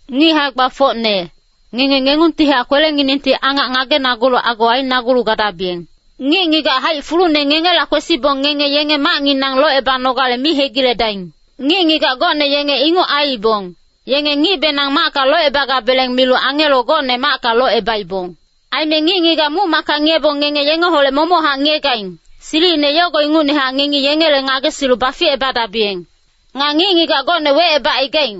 Ngic hae-gbafocne, ngenge ngengungtihac kwelenginengti angac ngagenagulu ago ainagulu gadabiyeng. Ngic-ngigac haic fulune ngengela kwesibong ngenge yenge macnginang locebanogale mi hegiledaing. Ngic-ngigac gocne yenge inguc aiibong, yenge ngicbenang macka locebagabeleng milu angelo gocne macka locebaibong. Aime ngic-ngigac muc-macka ngiyebong ngenge yengeholec momochac ngiyegaing, silicine yogo ingucnehac ngengi yengele ngagesilu baficebadabiyeng. Nga ngic-ngigac gocne wecebacaigaing,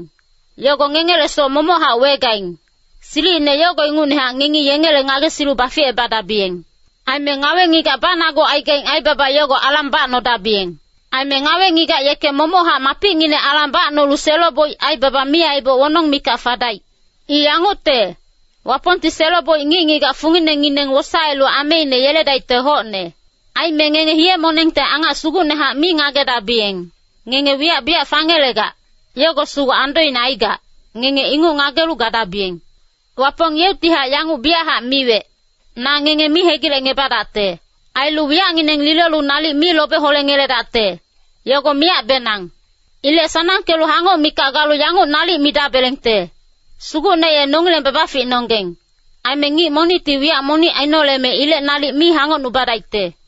yogo ngengele soc momochac wegaing, silicine yogo ingucnehac ngengi yengele ngagesilu baficebadabiyeng. Aime ngawe-ngigac banagucaigaing aibaba yogo alang bacnodabiyeng. Aime ngawe-ngigac yeke momochac mapicnginec alang bacnolu selo-boic aibaba mi aiboc wonong mikac fadaic. I yangucte, Wapongti selo-boic ngic-ngigac funginengineng wosaelu ameine yeledaicte hocne. Aime ngenge hiye-monengte angac sugucnehac mi ngagedabiyeng, ngenge wiyac biyac fangelegac, yogo sugu andoine aigac, ngenge inguc ngagelu gadabiyeng. Wapong yeuctihac yanguc biyachac miwec, “Na ngenge mi hegilecngebadacte. Ailu wiyacngineng lilolu nalic mi lobe holengeledacte, yogo miyacbenang.” Ilec sanangkelu hangoc mikac galu yanguc nalic midabelengte, “Sugucne ye nongileng babaficnonggeng, aime ngic monicti wiyac monic ainoleme ilec nalic mi hangocnubadaicte.”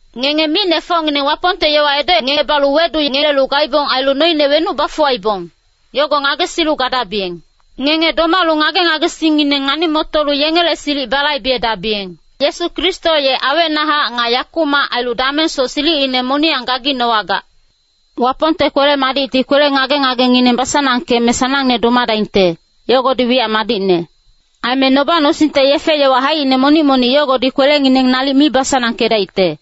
Ngenge micnefocngineng Wapongte yowa edocngebalu wedungelelu gaibong ailu noine wenuc bafuwaibong, yogo ngagesilu gadabiyeng. Ngenge domalu ngage-ngagesingngineng ngani-motolu yengele silic balaibedabiyeng. Yesu Kristo ye awecnahac nga yakumac ailu damengsoc silicine moniyang gaginowagac. Wapongte kwele-madicti kwele ngage-ngagengineng basanangkeme sanangne domadaingte, yogodi wiyac madicne. Aime noba-nosingte yefe-yowa haicine monic-monic yogodi kwelengineng nalic mi basanangkedaicte.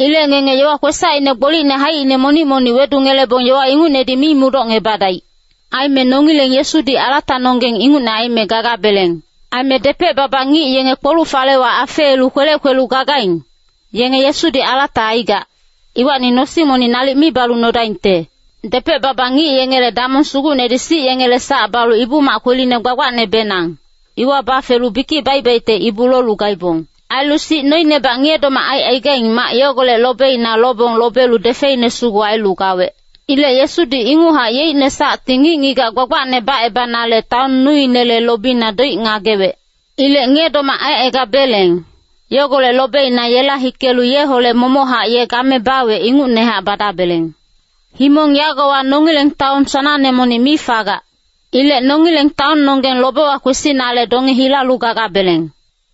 Ilec ngenge yowa kwesacine gbolicne haicine monic-monic wedungelebong yowa ingucnedi mi mudocngebadaic. Aime nongileng Yesudi alatanonggeng ingucne aime gagabeleng. Aime depec-baba ngic yenge kpoluc-falewa afeelu kwelec kwelu gagaing, yenge Yesudi alata aigac, iwacni nosing monic nalic mi balu nodaingte. Depec-baba ngic yengele damong sugucnedi sic yengele sac balu Ibu-mac Kweline Gbagbacnebenang, iwa bafelu bikic baic-baicte ibu lolu gaibong. Ailu sic noinebac ngiye-domac aicaigaing mac yogolec lobeina lobong lobelu defeine sugu ailu gawec. Ilec Yesudi inguchac yeicne sacti ngic-ngigac gbagbacne bacebanale taon nuinele lobina doic ngagewec. Ilec ngiye-domac aicaigabeleng, yogolec lobeina yela hikelu yeholec momochac ye game bawec ingucnehac badabeleng. Himong yagowa nongileng taon sanangne monic mi fagac. Ilec nongileng taonnonggeng lobewa kwesinale donge hilalu gagabeleng.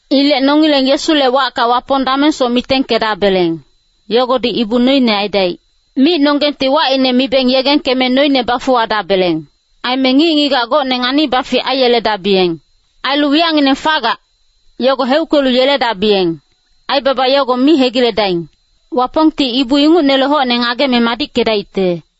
Ilec nongileng Yesule wacka Wapong damengsoc mitengkedabeleng, yogodi ibu noine aidaic. Micnonggengti wacine mibeng yegengkeme noine bafuwadabeleng. Aime ngic-ngigac gocne ngani-bafic aiyeledabiyeng. Ailu wiyacngineng fagac, yogo heuckelu yeledabiyeng, aibaba yogo mi hegiledaing. Wapongti ibu ingucnele hocne ngageme madickedaicte.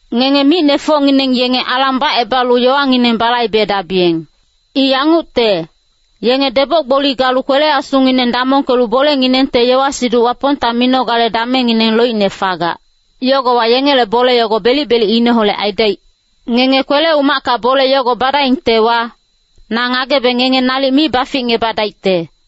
Ngenge micnefocngineng yenge alang bacebalu yowangineng balaibedabiyeng. I yangucte, yenge deboc-gboli galu kwele-asungineng damongkelu bolenginengte yowa-siduc Wapongta minogale damengngineng loicne fagac. Yogowa yengele bole yogo belic-belicineholec aidaic. Ngenge kwele-umacka bole yogo badaingtewa, na ngagebe ngenge nalic mi baficngebadaicte.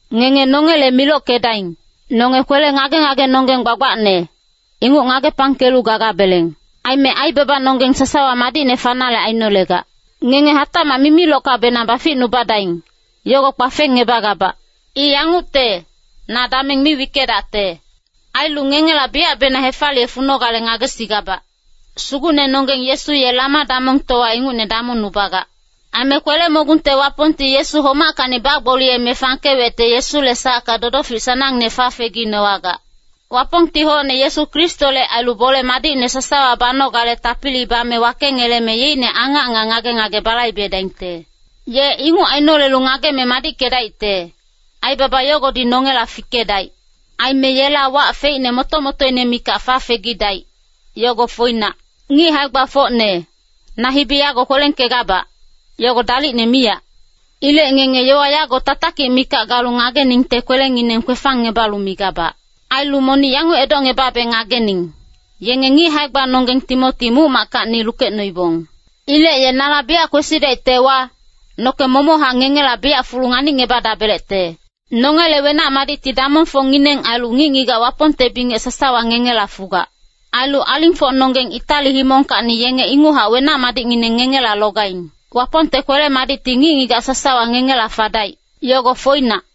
Ngenge nongele milockedaing. Nonge kwele ngage-ngagenonggeng gbagbacne, inguc ngagepangkelu gagabeleng. Aime aibabanonggeng sasawa madicne fanale ainolegac. Ngenge hatacmac mimilockabenang baficnubadaing, yogo kpafengngebagabac. I yangucte, na dameng mi wickedacte. Ailu ngengela biyacbenang hefaliye funogale ngagesigabac. Sugucnenonggeng Yesu ye lama-damongtowa ingucne damongnubagac. Aime Kwele-mogungte Wapongti Yesu homackacni bagboliyeme fangkewecte Yesule sacka dodofic sanangne fafeginowagac. Wapongti hocne Yesu Kristole ailu bole madicne sasawa banogale tapili bame wakengeleme yeicne angac nga ngage-ngage balaibedaingte. Ye inguc ainolelu ngageme madickedaicte, aibaba yogodi nongela fikedaic. Aime yela wac feicne moto-motoine mikac fafegidaic, yogo foinac. Ngic hae-gbafocne, na hibi yago kwelengkegabac, yogo dalicne miyac. Ilec ngenge yowa yago tatakic mikac galu ngageningte kwelengineng kwefangngebalu migabac. Ailu monic yanguc edocngebabe ngagening, yenge ngic hae-gbanonggeng Timoti muc-mackacni lukecnoibong. Ilec ye nala biyac kwesidaictewa, noke momochac ngengela biyac fulu nganicngebadabelecte. Nongele wenac-madicti damongfocngineng ailu ngic-ngigac Wapongte bingec sasawa ngengela fugac. Ailu alingfocnonggeng Itali himongkacni yenge inguchac wenac-madicngineng ngengela logaing. Wapongte kwele-madicti ngic-ngigac sasawa ngengela fadaic. Yogo foinac.